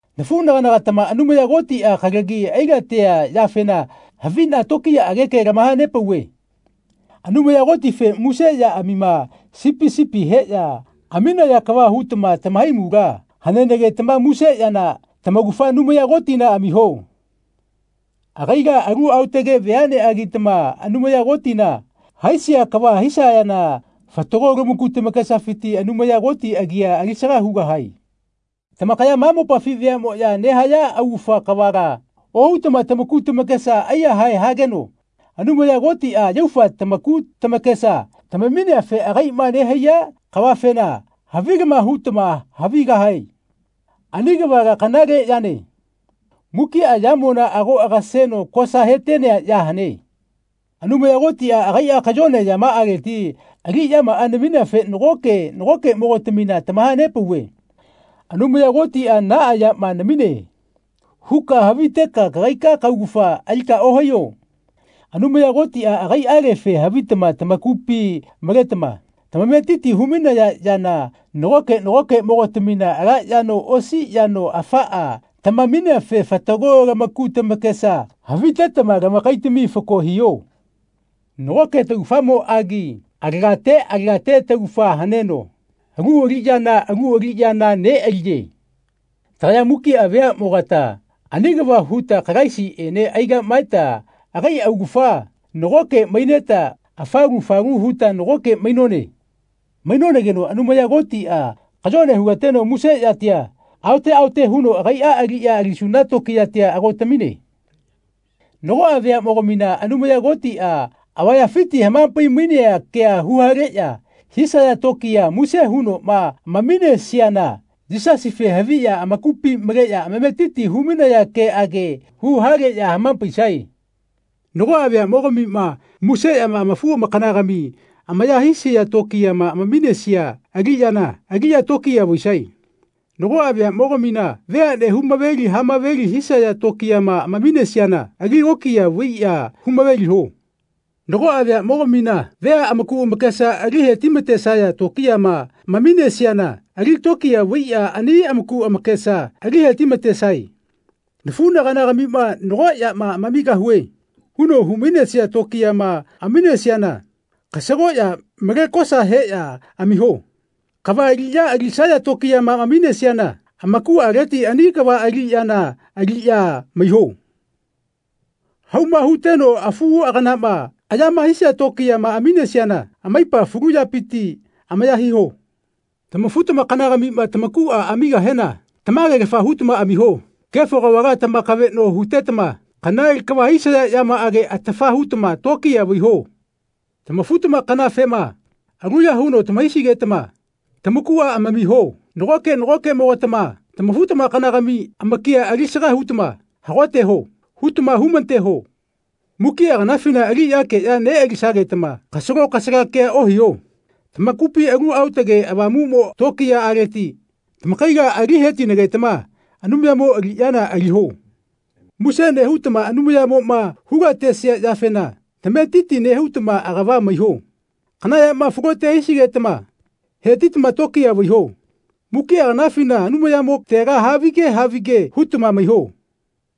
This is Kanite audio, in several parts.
Nafuꞌnaganagatama Anumaya Kotiꞌa kalagi ailatea yafena haviꞌna tokiyaꞌage ke lamahanepauve. Anumaya Kotife muse yaꞌamima sipi sipi heꞌya aminaya kava hutama tamahaimula hanenagetama muse yana tamaugafa Anumaya Kotina amiho. Agaila alu aotage veaꞌneꞌagitama Anumaya Kotina haisia kava hisayana fatago lamaku tamakesafiti Anumaya Koti agia alisaga hugahae. Tamakaya ma mopafi veaꞌmoꞌya nehaya augafa kavala ohutama lamaku tamakesa aiyahae hageno Anumaya Kotiꞌa yaufa lamaku tamakesa tamamineafe agaiꞌma nehaiya kavafena havilama hutama havigahae. Ani kavala kanale yane. Mukiꞌa yamona ago agaseno kosa hetenea ya hane. Anumaya Kotiꞌa agaiꞌa kayone yamaꞌaleti aliꞌyamaꞌa namineafe nagoke nagokeꞌmogatamina tamahanepauve “Anumaya Kotiꞌa naꞌa yama namine.” huka haviteka kagaika kaugafa alika ohaiyo. Anumaya Kotiꞌa agaiꞌalefe havitama tamakupi maletama tamametiti humainaya yana nagoke nagokeꞌmogatamina ala yano osi yano afaꞌa tamamineafe fatago lamaku tamakesa havitetama lamakaitami fako hiho. Nagoke taugafamoꞌagi alagate alagate taugafa haneno alu aliꞌya alu aliꞌyana neꞌaliye. Tagaya mukiꞌa veaꞌmogata ani kava huta Kalaisiꞌene aigaꞌmaeta agai augafa nagoke maineta afalu falu huta nagoke mainone. Mainonageno Anumaya Kotiꞌa kayone hulateno muse yatia haote haote huno agaiꞌa aliꞌya alisuna tokiyatia ago tamine. Nagoꞌa veaꞌmogamina Anumaya Kotiꞌa avayafiti hamapai-mainea kea huhaleꞌya hisaya tokiya muse hunoꞌma amaminesiana Yisasife haviꞌya amakupi maleꞌya amametiti humainaya keꞌage huhaleꞌya hamapaisae. Nagoꞌa veaꞌmogamima muse yama amafu-amakanagami amaya hisaya tokiyama amaminesia aliꞌyana aliꞌya tokiya vaisae. Nagoꞌa veaꞌmogamina veaꞌne humaveli hamaveli hisaya tokiyama amaminesiana ali lokiya vaiꞌya humaveliho. Nagoꞌa veaꞌmogamina vea amaku amakesa ali hetimatesaya tokiyama amaminesiana ali tokiya vaiꞌya ani amaku amakesa ali hetimatesae. “Nafuꞌnaganagamima nago yama amamigahue.” huno humainesia tokiyama amaminesiana kasagoꞌya male kosa heꞌya amamiho. Kava aliꞌya alisaya tokiyama amaminesiana amakuꞌaleti ani kava aliꞌyana aliꞌya maiho. Hauma huteno afuꞌaganama ayama hisia tokiyama amaminesiana amaipa falu yapiti amaya hiho. Tamafu-tamakanagamima tamakuꞌa amamigahena tamagelafa hutama amamiho. Kefo kavala tamakaveꞌno hutetama kanale kava hisaya yamaꞌage atafa hutama tokiya vaiho. Tamafu-tamakanafema aluya huno tamahaisigetama tamakuꞌa amamiho. Nagoke nagokeꞌmogatama tamafu-tamakanagami amakia alisaga hutama “Hagoteho.” hutama humateho. Mukiꞌa kanafina aliꞌyageꞌya neꞌalisagetama kasalo kasala kea ohiho. Tamakupina Alu Aotage Avamuꞌmo tokiyaꞌaleti tamakaila ali hetinagetama Anumayamo aliꞌyana aliho. Muse nehutama Anumayamoꞌma hulatesia yafena tamametiti hutama agava maiho. Kana yama falote hisigetama hetitama tokiya vaiho. Mukiꞌa kanafina Anumayamotega havige havige hutama maiho.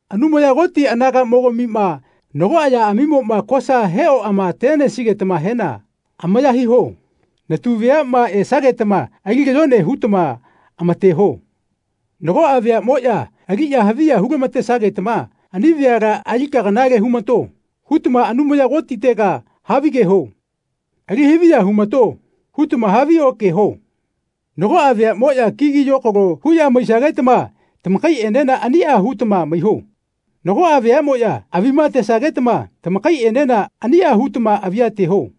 Anumaya Koti anagaꞌmogamima nagoꞌa yaꞌamimoꞌma kosa heoꞌamatesigetamahena amaya hiho. Natu veaꞌma esagetama ali kayone hutama amateho. Nagoꞌa veaꞌmoꞌya ali haviya hulamatesagetama “Ani veala alika kanale humato.” hutama Anumaya Kotitega havigeho. “Alihaviya humato.” hutama haviokeho. Nagoꞌa veaꞌmoꞌya kigi yokalo huꞌya maisagetama tamakaiꞌenena aniꞌa hutama maiho. Nagoꞌa veaꞌmoꞌya avima atesagetama tamakaiꞌenena aniꞌa hutama avia ateho.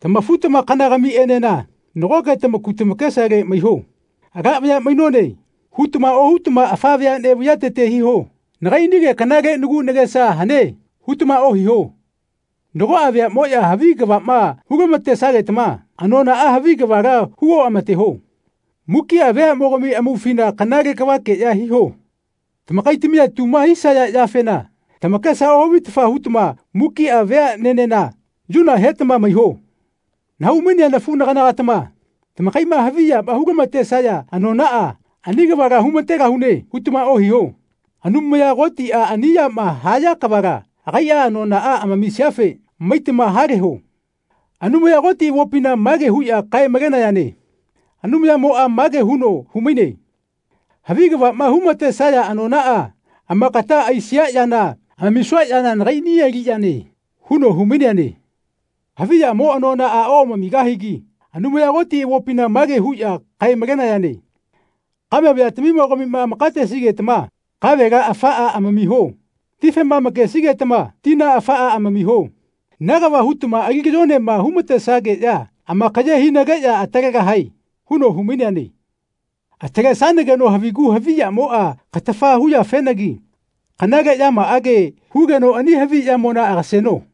Tamafu-tamakanagamiꞌenena nagoke tamaku tamakesale maiho. “Ala vaya mainone.” hutama ohutama afa veaꞌnene vaiyatete hiho. “Nagaiꞌnige kanale nagu nagesa hane.” hutama ohiho. Nagoꞌa veaꞌmoꞌya havi kavaꞌma hulamatesagetama anonaꞌa havi kavala hu oꞌamateho. Mukiꞌa veaꞌmogami amaufina kanale kavakeꞌya hiho. Tamakaitamia tuma hisaya yafena tamakesa ohavitafa hutama mukiꞌa veaꞌnenena yuna hetama maiho. Nahaumainea nafuꞌnaganagatama tamakaiꞌma havi yama hulamatesaya anonaꞌa “Ani kavala humategahune.” hutama ohiho. Anumaya Kotiꞌa ani yama haya kavala agaiꞌa anonaꞌa amamisiafe maitama haleho. Anumaya Koti avopina mage huꞌya kae-malenayane Anumayamoꞌa mage huno humaine “Havi kavaꞌma humatesaya anonaꞌa amakata aisia yana amamisua yana nagaiꞌni aliꞌyane.” huno humaineane. Havi yamo anonaꞌa oꞌamamigahagi Anumaya Koti avopina mage huꞌya kae-malenayane Kame vayatamimogamima amakatesigetama kavela afaꞌa amamiho. Tifema amakesigetama tina afaꞌa amamiho. Na kava hutama ali kayonema humatesageꞌya amakaye hinageꞌya atalegahae huno humaineane. Atalesanageno havigu havi yamoꞌa katafa huyafenagi kanale yamaꞌage hugeno ani havi yamona agaseno.